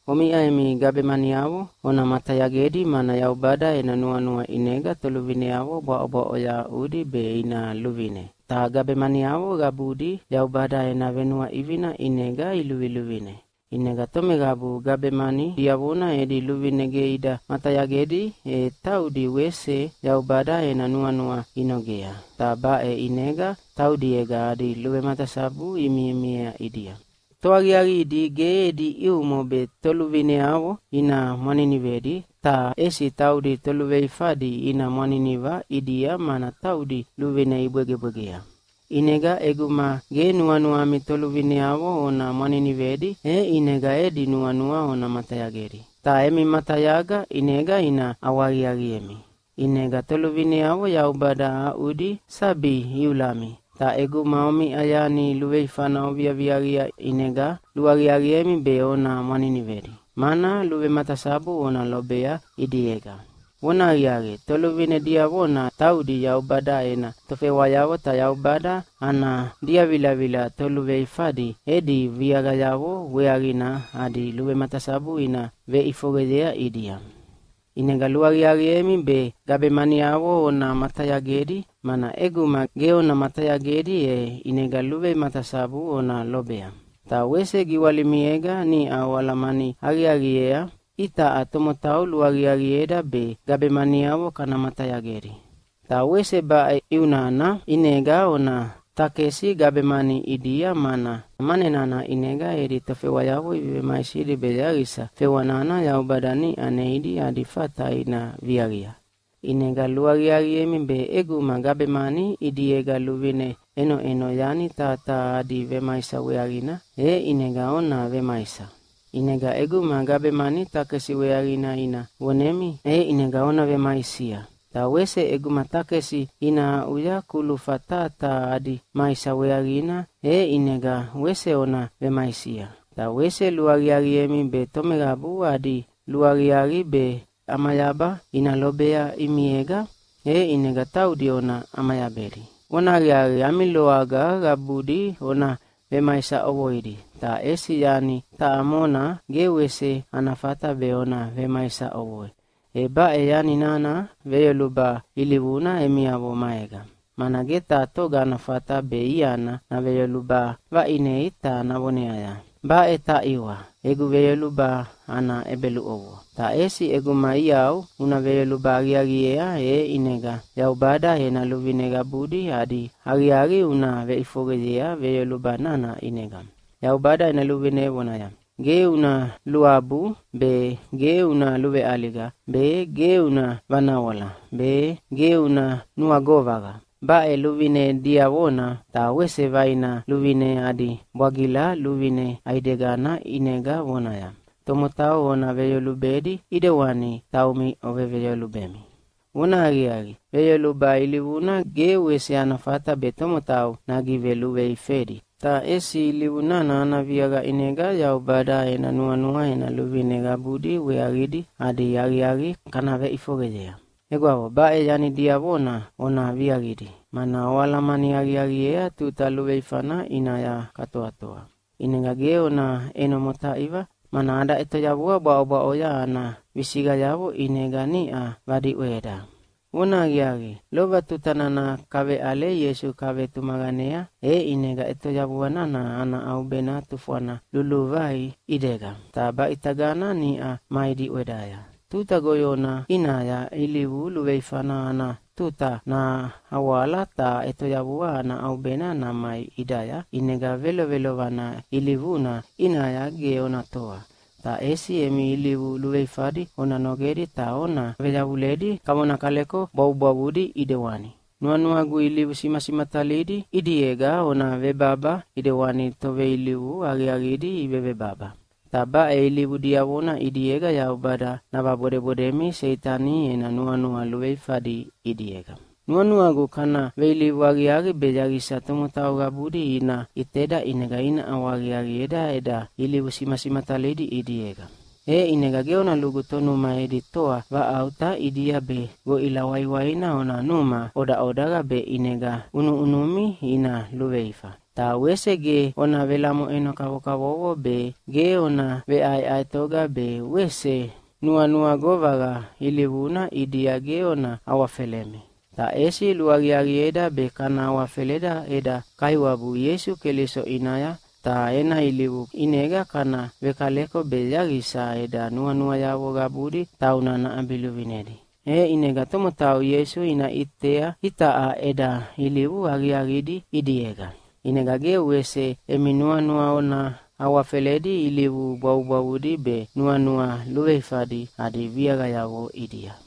Omiʼa emi gabemaniavo ona matayagedi, mana Yaubada ena nuanua ʼinega toluvineavo bwaʼobwaʼoya aʼudi be ina luvine. Ta gabemaniavo qabudi Yaubada ena venuaʼivina ʼinega iluviluvine. ʼInega tomeqabu gabemani diavona edi luvine ge ida matayagedi, e taudi wese Yaubada ena nuanua inogea, ta baʼe ʼinega taudiega adi luvematasabu imimiea ʼidia. Toaqiaqidi ge edi ʼiumo be toluvineavo ina mwaninivedi, ta ʼesi taudi toluveifadi ina mwaniniva ʼidia, mana taudi luvine ibwegebwegea. ʼInega ʼeguma ge nuanuami toluvineavo ona mwaninivedi, e ʼinega edi nuanua ona matayagedi. Ta emi matayaga ʼinega ina ʼawahaqiaqiemi. ʼInega toluvineavo Yaubada aʼudi sabi iulami. Ta ʼeguma omiʼa yani luveifana oviaviaqia ʼinega luaqiaqiemi be ona mwaninivedi, mana luvematasabu ona lobea ʼidiega. Vonahaqiaqi, toluvine diavona taudi Yaubada ena tofewayavo, ta Yaubada ana diavilavila toluveifadi edi viaqayavo weaqina adi luvematasabu ina veʼifoqeyea ʼidia. ʼInega luaqiaqiemi be gabemaniavo ona matayagedi, mana ʼeguma ge ona matayagedi e ʼinega luvematasabu ona lobea. Ta wese giwalimiega niʼa oalamani aqiaqiea itaʼa tomotau luaqiaqieda be gabemaniavo kana matayagedi. Ta wese baʼe ʼiu nana ʼinega ona takesi gabemani ʼidia, mana mane nana ʼinega edi tofewayavo ivevemaisidi be yaqisa fewa nana Yaubada niʼa neidi adi fata ina viaqia. ʼInega luaqiaqiemi be ʼeguma gabemani ʼidiega luvine ʼenoʼeno yani taha taha adi vemaisa weaqina, e ʼinega ona vemaisia. ʼInega ʼeguma gabemani takesi weaqina ina vonemi, e ʼinega ona vemaisia. Ta wese ʼeguma takesi ina aʼuya kulufa taha taha adi maisa weaqina, e ʼinega wese ona vemaisia. Ta wese luaqiaqiemi be tomeqabu adi luaqiaqi be ʼamayaba ina lobea ʼimiega, e ʼinega taudi ona ʼamayabedi. Vonahaqiaqi, ami loaga qabudi ona vemaisa ʼovoidi, ta ʼesi yani taʼa mona ge wese ana fata be ona vemaisa ʼovoi, e baʼe yani nana veyoluba ilivuna emiavo maega. Mana ge taha toga ana fata be iana naveyoluba vaʼinei ta navoneaya, “Baʼe taʼiwa, egu veyoluba ana ʼebeluʼovoa!” Ta ʼesi ʼeguma iau una veyoluba aqiaqiea, e ʼinega Yaubada ena luvine qabudi adi aqiaqi una veʼifoqeyea veyoluba nana ʼinega. Yaubada ena luvine vonaya, “Ge una luabu be, ge una luveʼaliga be, ge una vanawala be, ge una nuagovaqa.” Baʼe luvine diavona ta wese vaina luvine adi bwagila luvine ʼaidegana ʼinega vonaya, “Tomotau ona veyolubedi ʼidewani taumi oveveyolubemi!” Vonahaqiaqi, veyoluba ilivuna ge wese ana fata be tomotau nagiveluveifedi, ta ʼesi ilivu nana ana viaqa ʼinega Yaubada ena nuanua ena luvine qabudi weaqidi adi aqiaqi kana veʼifoqeyea. Egwavo, baʼe yani diavona ona viaqidi, mana oalamani aqiaqiea tuta luveifana ʼinaya katoatoa. ʼInega ge ona ʼeno motaiva, mana ada ʼetoyavua bwaʼobwaʼo ana visiqayavo ʼinega niʼa vadiʼweda. Vonahaqiaqi, lova tuta nana kaveʼale Ieisu kavetumaqanea, e ʼinega ʼetoyavua nana ana ʼaubena tufwana luluvai ʼidega, ta baʼitagana niʼa mai diʼwedaya. Tuta goyona ʼinaya ilivu luveifana ana tuta nahawala ta ʼetoyavua ana ʼaubena namai ʼidaya, ʼinega velovelovana ilivuna ʼinaya ge ona toa. Ta ʼesi emi ilivu luveifadi ona nogedi ta ona veyavuledi kavona kaleko bwavubwavudi ʼidewani. Nuanuagu ilivu simasimatalidi ʼidiega ona vebaba ʼidewani toveilivu aqiaqidi ivevebaba. Ta baʼe ilivu diavona ʼidiega Yaubada navabodebodemi Seitani ena nuanua luveifadi ʼidiega. Nuanuagu kana veilivu aqiaqi be yaqisa tomotau qabudi ina ʼiteda ʼinega ina ʼawahaqiaqieda eda ilivu simasimatalidi ʼidiega. E ʼinega ge ona lugu tonuma edi toa vaʼauta ʼidia be goʼila waiwaina ona numa ʼodaʼodaqa be ʼinega ʼunuʼunumi ina luveifa. Ta wese ge ona velamoʼeno kavokavovo be, ge ona veʼaeʼaetoga be, wese nuagovaqa ilivuna ʼidia ge ona awafelemi! Ta ʼesi luaqiaqieda be kana awafeleda eda Kaiwabu Ieisu Keliso ʼinaya, ta ena ilivu ʼinega kana vekaleko be yaqisa eda nuanuayavo qabudi tauna naʼabiluvinedi, e ʼinega tomotau Ieisu ina ʼitea itaʼa eda ilivu aqiaqidi ʼidiega. ʼInega ge wese emi nuanua ona awafeledi ilivu bwavubwavudi be nuanua luveifadi adi viaqayavo ʼidia.